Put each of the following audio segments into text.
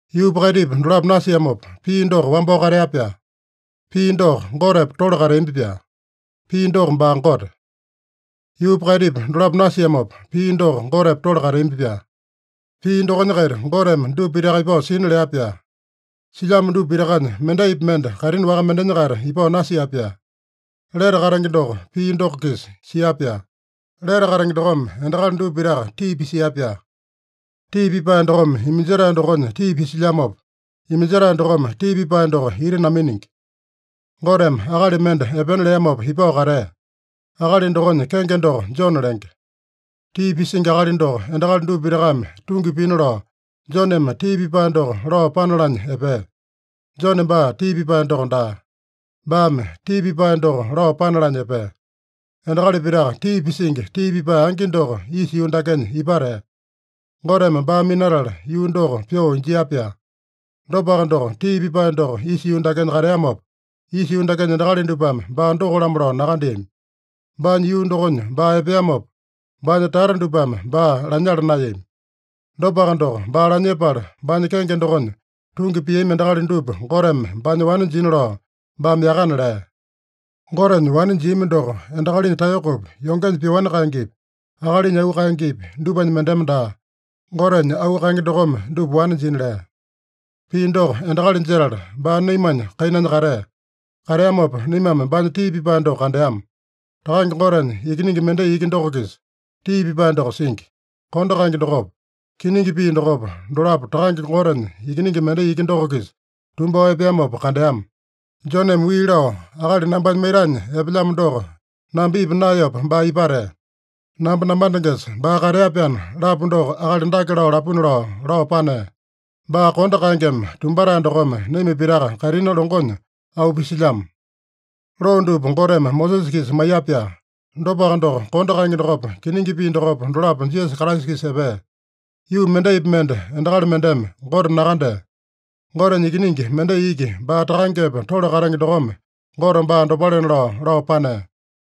Yuupa kaitipa dolapo nasiamopa, Pii doko wambao katea-pyaa. Pii doko Gotepa tole kateambi-pyaa. Pii doko baa Gote. Yuupa kaitipa dolapo nasiamopa, Pii doko Gotepa tole kateambi-pyaa. Pii dokonya-kaita Goteme dupa pitaka ipao sina lea-pyaa. Silyamo dupa pitakanya mendaipi mende kaitini waka mendenya-kaita ipao nasia-pyaa. Lete katenge doko Pii doko-kisa sia-pyaa. Lete katenge dokome endakali dupa pitaka tii pisia-pyaa. Tii pipae dokome iminjetae dokonya tii pisilyamopa, iminjetae dokome tii pipae doko ita naminingi. Goteme akali mende epena leamopa ipao katea. Akali dokonya kenge doko Jone lenge. Tii pisingi akali doko endakali dupa pitakame tungi pina lao, Joneme tii pipae doko lao panalanya epea. Jone baa tii pipae doko daa. Baame tii pipae doko lao panalanya epea. Endakali pitaka tii pisingi tii pipae angi doko isa yuu dakenya ipatea. Goteme baa minatala yuu doko pyoo injia-pyaa. Dopaka doko, tii pipae doko isa yuu dakenya kateamopa, isa yuu dakenya endakali dupame baa doko-lamo lao nakandeami. Baanya yuu dokonya baa epeamopa, baanya tata dupame baa lanyala naeyami. Dopaka doko, baa lanyepala baanya kenge dokonya tungi piami endakali dupa Goteme baanya wane jina lao baame yakana lea. Gotenya wane jiami doko, endakalinya taeyokopi, yongenya pyoani kaengepi, akalinya auu kaengepi, dupanya mendeme daa, Gotenya auu kaenge dokome dupa wane jina lea. Pii doko endakali jetala, baa naimanya kainanya katea. Kateamopa naimame baanya tii pipae doko kandeama. Takange Gotenya Ikiningi mendai iki doko-kisa tii pipae doko singi. Kondo kaenge dokopa, kiningi pii dokopa, dolapo Takange Gotenya Ikiningi mendai iki doko-kisa tumbao epeamopa kandeama. Joneme wii lao, “ ‘Akali nambanya maitanya epelyamo doko namba ipa naeyopa baa ipatea. Namba namandengesa baa katea-pyaana’ lapu doko akali dake lao lapuna” lao, lao panea. Baa kondo kaengeme tumbatae dokome naima pitaka kaitini longonya auu pisilyamo. Loo dupa Goteme Mosesa-kisa maiya-pyaa. Dopaka doko, kondo kaenge dokopa, kiningi pii dokopa, dolapo Jisasa Kraisa-kisa epea. Yuu mendaipi mende endakali mendeme Gote nakandea. Gotenya Ikiningi mendai iki, baa Takangepa tole katenge dokome Gote baa dopalena lao, lao panea.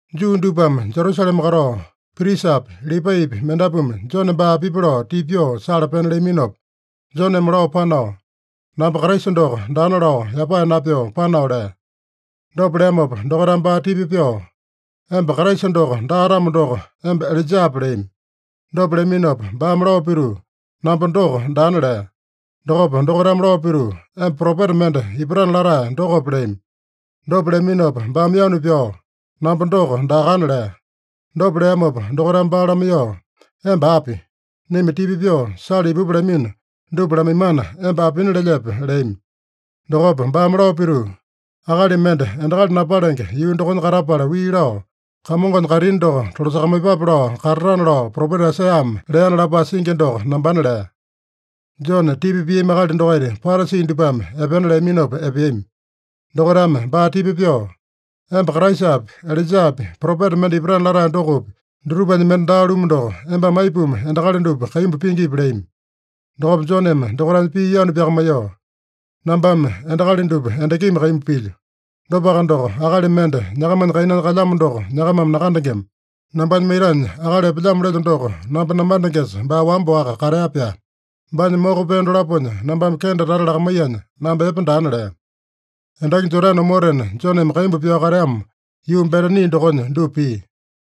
Juu dupame Jerusalema katao prisapi, Lipaipi mendapuame Jone baa apipi lao tipa pyoo sala pena leaminopa, Joneme lao panao, “Namba Kraisa doko daana” lao yapae napyoo panao lea. Dopa leamopa dokaitame baa tipa pyoo, “Emba Kraisa doko daa-tamo doko, emba Ilaijape?” leami. Dopa leaminopa baame lao pituu, “Namba doko daana” lea. Dokopa dokaitame lao pituu, “Emba propeta mende ipatana latae dokope?” leami. Dopa leaminopa baame yanu pyao, “Namba doko daakana” lea. Dopa leamopa dokaitame baa lamaiyoo, “Emba api? Naima tipa pyoo sala ipupa lamino dupa lamaimana, emba apina lelyepe?” leami. Dokopa baame lao pituu, “ ‘Akali mende endakali napalenge yuu dokonya katapala wii lao, “Kamongonya kaitini doko tolasakamaiyepape” lao katatana’ lao, propeta Aisaiyame leana lapae singi doko nambana” lea. (Jone tipa piami akali dokaita Parasi dupame epena leaminopa epeami.) Dokaitame baa tipa pyoo, “Emba Kraisapi, Ilaijapi, propeta mende ipatana latae dokopi, dutupanya mende daa-lumu doko, embame aipuma endakali dupa kaimbu pingipi?” leami. Dokopa Joneme dokaitanya pii yanu pyakamaiyoo, “Nambame endakali dupa endakimi kaimbu pilyo. Dopaka doko, akali mende nyakamanya kainanya kalyamo doko nyakamame nakandengema. Nambanya maitanya akali epelyamo lelyo doko namba namandengesa baa wamba-waka katea-pyaa. Baanya moko pee dolaponya nambame kende tata lakamaiyanya, namba epe daana” lea. Endaki Jodane omotena Joneme kaimbu pyao kateamo, yuu Betani dokonya dupa pia.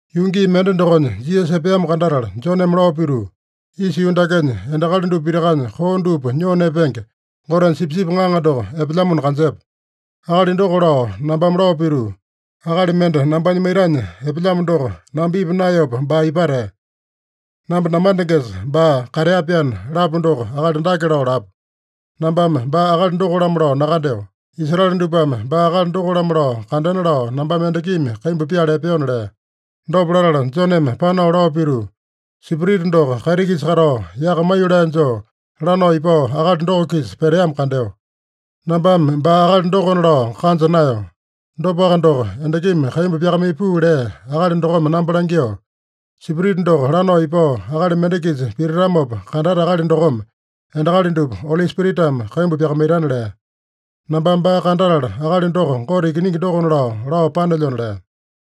Yuu gii mende dokonya, Jisasa epeamo kandatala Joneme lao pituu, “Isa yuu dakenya endakali dupa pitakanya koo dupa nyoo nepenge, Gotenya Sipisipi Ŋaŋa doko epelyamona kanjepa. Akali doko lao nambame lao pituu, ‘Akali mende nambanya maitanya epelyamo doko namba ipa naeyopa baa ipatea. Namba namandengesa baa katea-pyaana’ lapu doko, akali dake lao lapu. Nambame baa akali doko-lamo lao nakandeo. Israele dupame baa akali doko-lamo lao kandena lao nambame endakimi kaimbu pyala epeona” lea. Dopa latala Joneme panao lao pituu, “Spirita doko kaiti-kisa katao, yaka maiyolee joo lanao ipao akali doko-kisa peteamo kandeo. Nambame baa akali dokona lao kanja naeyo. Dopaka doko, endakimi kaimbu pyakamaiya puu lea Akali dokome namba langyoo, ‘Spirita doko lanao ipao akali mende-kisa pititamopa kandate akali dokome endakali dupa Oli Spiritame kaimbu pyakamaitana’ lea. Nambame baa kandatala, akali doko Gote Ikiningi dokona lao, lao panelyona” lea.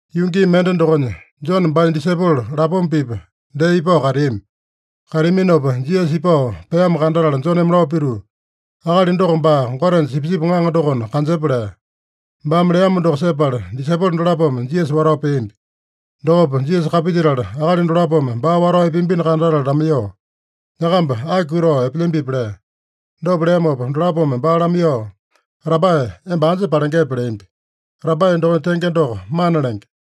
Yuu gii mende dokonya Jone baanya disaipolo lapoma-pipa dee ipao kateami. Kateaminopa Jisasa ipao peamo kandatala Joneme lao pituu, “Akali doko baa Gotenya Sipisipi Ŋaŋa dokona kanjepa” lea. Baame leamo doko sepala, disaipolo dolapome Jisasa watao peambi. Dokopa Jisasa kapilyetala, akali dolapome baa watao epeambino kandatala lamaiyoo, “Nyakamba aki kutao epelyambipi?” lea. Dopa leamopa dolapome baa lamaiyoo, “Rabae, emba anja palengepe?” leambi. (Rabae dokonya tenge doko, Mana lenge.)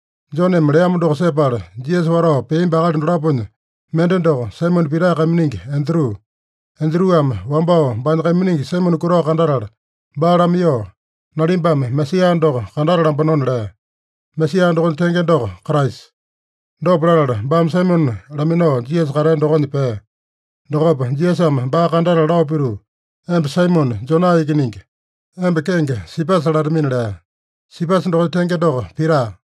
Joneme leamo doko sepala Jisasa watao peambi akali dolaponya mende doko, Saimone Pita kaiminingi Andru. Andruame wambao baanya kaiminingi Saimone kutao kandatala baa lamaiyoo, “Nalimbame Mesaeya doko kandatalambanona” lea. (Mesaeya dokonya tenge doko, Kraisa.) Dopa latala baame Saimone laminao Jisasa katea dokonya pea. Dokopa Jisasame baa kandatala lao pituu, “Emba Saimone, Jona ikiningi. Emba kenge Sipasa latamina” lea. (Sipasa dokonya tenge doko, Pita.)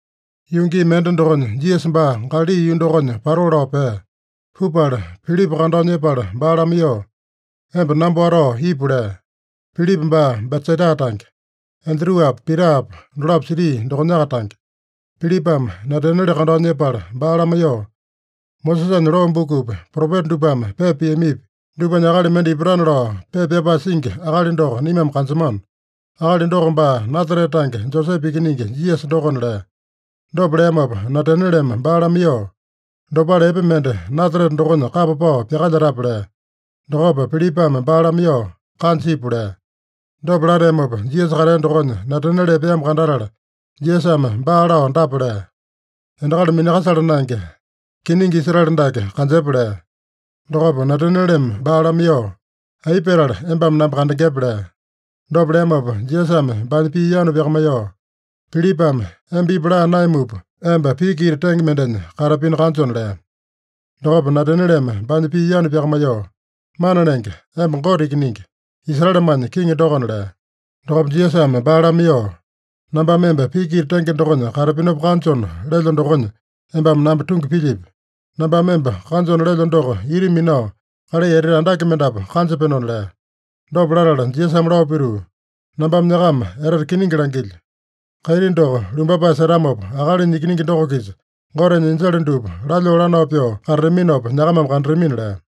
Yuu gii mende dokonya Jisasa baa Galali yuu dokonya patoo lao pea. Pupala, Pilipa kandao nyepala baa lamaiyoo, “Emba namba watao ipu” lea. (Pilipa baa Betsaida tange. Andruapa, Pitapa dolapo siti dokonyaka tange.) Pilipame Nataniele kandao nyepala baa lamaiyoo, “Mosesanya loo bukupi, propeta dupame pepa piamipi, dupanya akali mende ipatana lao pepa pyapae singi akali doko naimame kanjemano. Akali doko baa Nasarete tange Josepe ikiningi Jisasa dokona” lea. Dopa leamopa Natanieleme baa lamaiyoo, “Dopale epe mende Nasarete dokonya kapa pao pyakalyetape?” lea. Dokopa Pilipame baa lamaiyoo, “Kanja ipu” lea. Dopa lateamopa, Jisasa katea dokonya Nataniele epeamo kandatala, Jisasame baa lao dapa lea: “Endakali minakasala naenge, kiningi Israele dake kanjepa” lea. Dokopa Natanieleme baa lamaiyoo, “Aipa petala embame namba kandengepe?” lea. Dopa leamopa Jisasame baanya pii yanu pyakamaiyoo, “Pilipame emba ipu laa naeyamupa, emba piki ita tenge mendenya katapino kanjona” lea. Dokopa Natanieleme baanya pii yanu pyakamaiyoo, “Mana Lenge, emba Gote Ikiningi, Israelemanya kiŋi dokona” lea. Dokopa Jisasame baa lamaiyoo, “Nambame emba piki ita tenge dokonya katapinopa kanjona lelyo dokonya, embame namba tungi pilyipi? Nambame emba kanjona lelyo doko ita minao kalai etete andake mendapu kanjapenona” lea. Dopa latala Jisasame lao pituu, “Nambame nyakama etete kiningi langilyo: Kaiti doko lumbapae setamopa, Akalinya Ikiningi doko-kisa Gotenya enjele dupa lalyoo lanao pyoo katataminopa nyakamame kandatamina” lea.